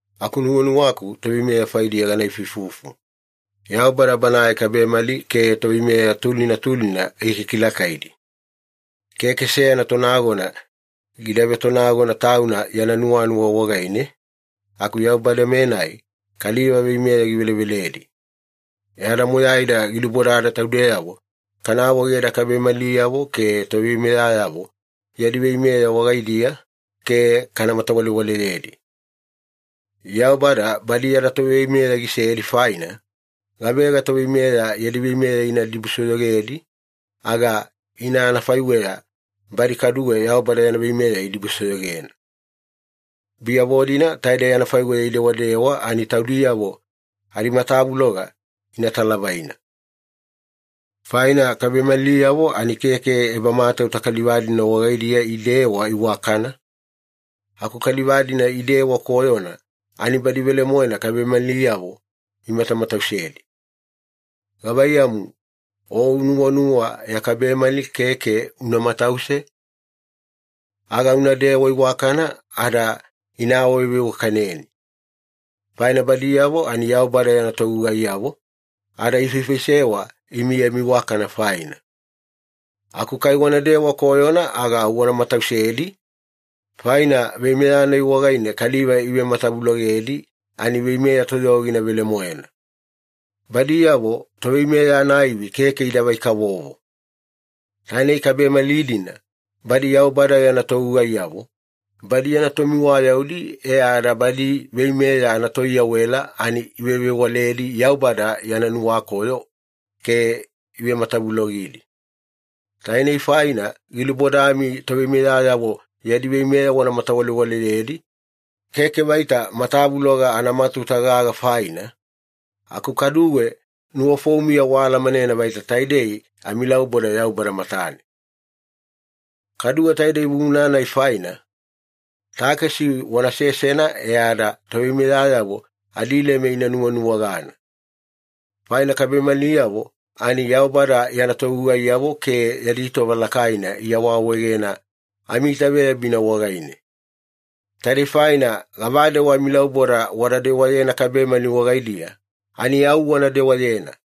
Aku nuwanuwaku toveimeya faidiya gana ifuifufu. Yaubada Banae kabemali ke toveimeya tulina tulina gikikilakaidi. Keke seyana tonagona gida vetonagona tauna yana nuwanuwa wagaine, aku Yaubada-menai kaliva veimeya giveleveledi. E ada moyaida gilubodada taudeyavo kana awaegeda kabemaliyavo ke toveimeyayavo yadi veimeya wagaidiya ke kana matawalewaleyedi. Yaubada badi yada toveimeya gisedi faina, gavega toveimeya yadi veimeya ina dibusoyogedi, aga ina anafaiweya badi kaduwe Yaubada yana veimeya idibusoyogena. Biyavo-dina taidei anafaiweya idewadewa ani taudiyavo adimatavuloga ina talavaina. Faina kabemaliyavo ani keke ebamatauta kaliva-dina wagaidiya idewa iwakana, aku kaliva-dina idewa koyona ani badi velemoena kabemaliyavo imatamatausedi. Gavaiyamu, o nuwanuwa ya kabemali keke una matause? Aga unadewa iwakana ada ina awaveiwakaneni. Faina badiyavo ani Yaubada yana togugaiyavo, ada ifaifaisewa imi yami iwakana faina. Aku kai wanadewa koyona aga au wana matausedi, faina veimeya-nai wagaine kaliva ivematavulogedi ani veimeya toyogina velemoena. Badiyavo toveimeya anaivi keke idavai-kavovo. Tainei kabemali-dina badi Yaubada yana togugaiyavo, badi yana tomiwayaudi e ada badi veimeya anatoiyawela ani ivevewaledi Yaubada yana nuwakoyo ke ivematavulogidi. Tainei faina gilubodami toveimeyayavo yadi veimeya wana matawalewaleyedi, keke vaita matavuloga anamatauta gaga faina, aku kaduwe nuwafoumiya waalamanena vaita taidei amilauboda Yaubada matane. Kaduwe taidei vuvuna-nai faina, takesi wana sesena e ada toveimeyayavo adileme ina nuwanuwagana. Faina kabemaliyavo ani Yaubada yana togugaiyavo ke yadi tova lakaina iawaawaegena amiitaveyabina wagaine. Taidei faina gavadewa amilauboda wada dewayena kabemali wagaidiya, ani au wana dewayena.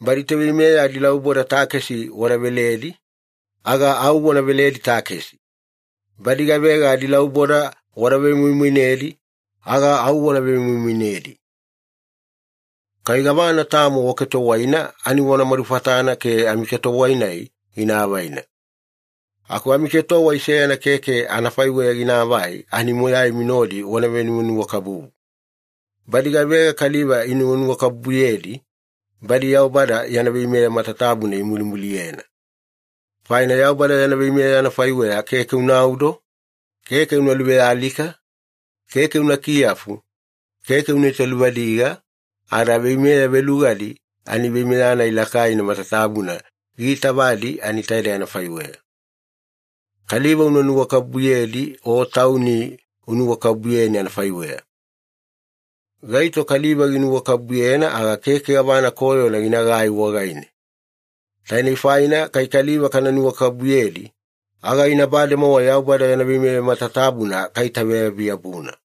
Badi toveimeya adilauboda takesi wada veledi, aga au wana veledi takesi. Badi gavega adilauboda wada vemoimoinedi, aga au wana vemoimoinedi. Kai gavana tamo waketowaina ani wana madufatana ke amiketowai-nai gina avaina. Aku amiketowai seyana keke anafaiweya ginaavai ani moyaimi nodi wana venuwanuwakabubu. Badi gavega kaliva inuwanuwakabubuyedi, badi Yaubada yana veimeya matatabuna imulimuliyena. Faina Yaubada yana veimeya anafaiweya keke unaudo, keke una luvealika, keke una kiyafu, keke una italuvadiga, ada veimeya velugadi ani veimeya-nai lakaina matatabuna giitavadi ani taidei anafaiweya. “Kaliva una nuwakabubuyedi o tauni unuwakabubuyeni anafaiweya.” Gaito kaliva ginuwakabubuyena aga keke gavana koyona ginagai wagaine. Tainei faina kai kaliva kana nuwakabubuyedi, aga ina bademowa Yaubada yana veimeya matatabuna kaitaveyabi-yabuna.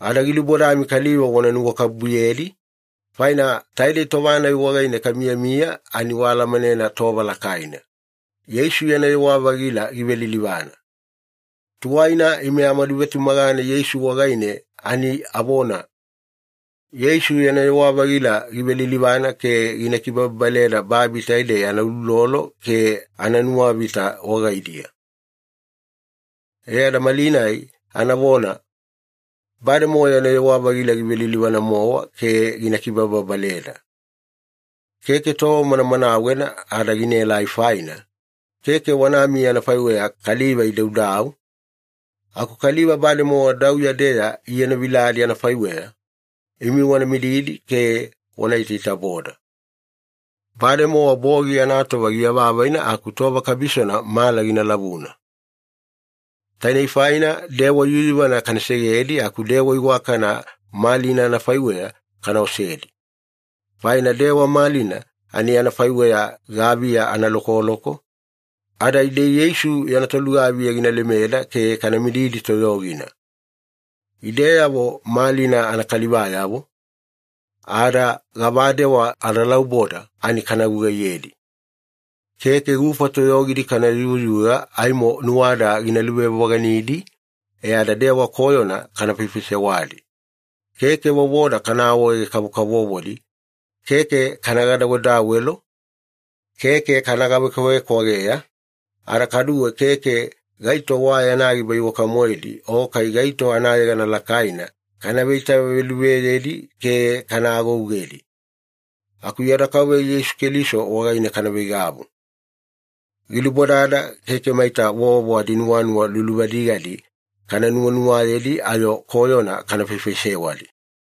Ada gilubodami kaliva wana nuwakabubuyedi, faina taidei tova-nai wagaine kamiyamiya ani waalamanena tova lakaina. Yeisu yana yewa-vagila givelilivana. Tuwaina ime amaduvetumagana Yeisu wagaine ani avona, “Yeisu yana yewa-vagila givelilivana ke gina kibababaleda babi taidei anauloulolo ke ananuwavita wagaidiya.” E ada malinai anavona, “Bademowa yana yewa-vagila givelilivana-mowa ke gina kibababaleda.” Keke tova manamanawena ada ginaelai faina, keke wanamiya anafaiweya kaliva idaudau, aku kaliva bademowa dauya-deya ienoviladi anafaiweya, imi wana mididi ke wana itaitaboda. Bademowa bogi anatova giavavaina aku tova kabisona mala gina lavuna. Tainei faina dewa yuyuvana kana segedi aku dewa iwakana malina anafaiweya kana osedi. Faina dewa malina ani anafaiweya gaviya analokoloko, ada ide Yeisu yana tolugaviya gina lemeda ke kana mididi toyogina. Ideyavo malina anakalivayavo, ada gavadewa adalauboda ani kana gugaiyedi. Keke gufa toyogidi kana yuyuga aimo nuwada gina luvevoganidi e ada dewa koyona kana faifaisewadi. Keke vovoda kana awaege-kavokavovodi, keke kana gadawedawelo, keke kana gavekwavekwageya, ada kaduwe keke gaito wa yana giba iwaka-moedi o kai gaito anayegana lakaina kana veitaveluveyedi ke kana agougedi. Aku yada Kauveya Yeisu Keliso wagaine kana veigavu. Gilubodada keke maita vovo adinuwanuwa luluvadigadi kana nuwanuwayedi ayo koyona kana faifaisewadi.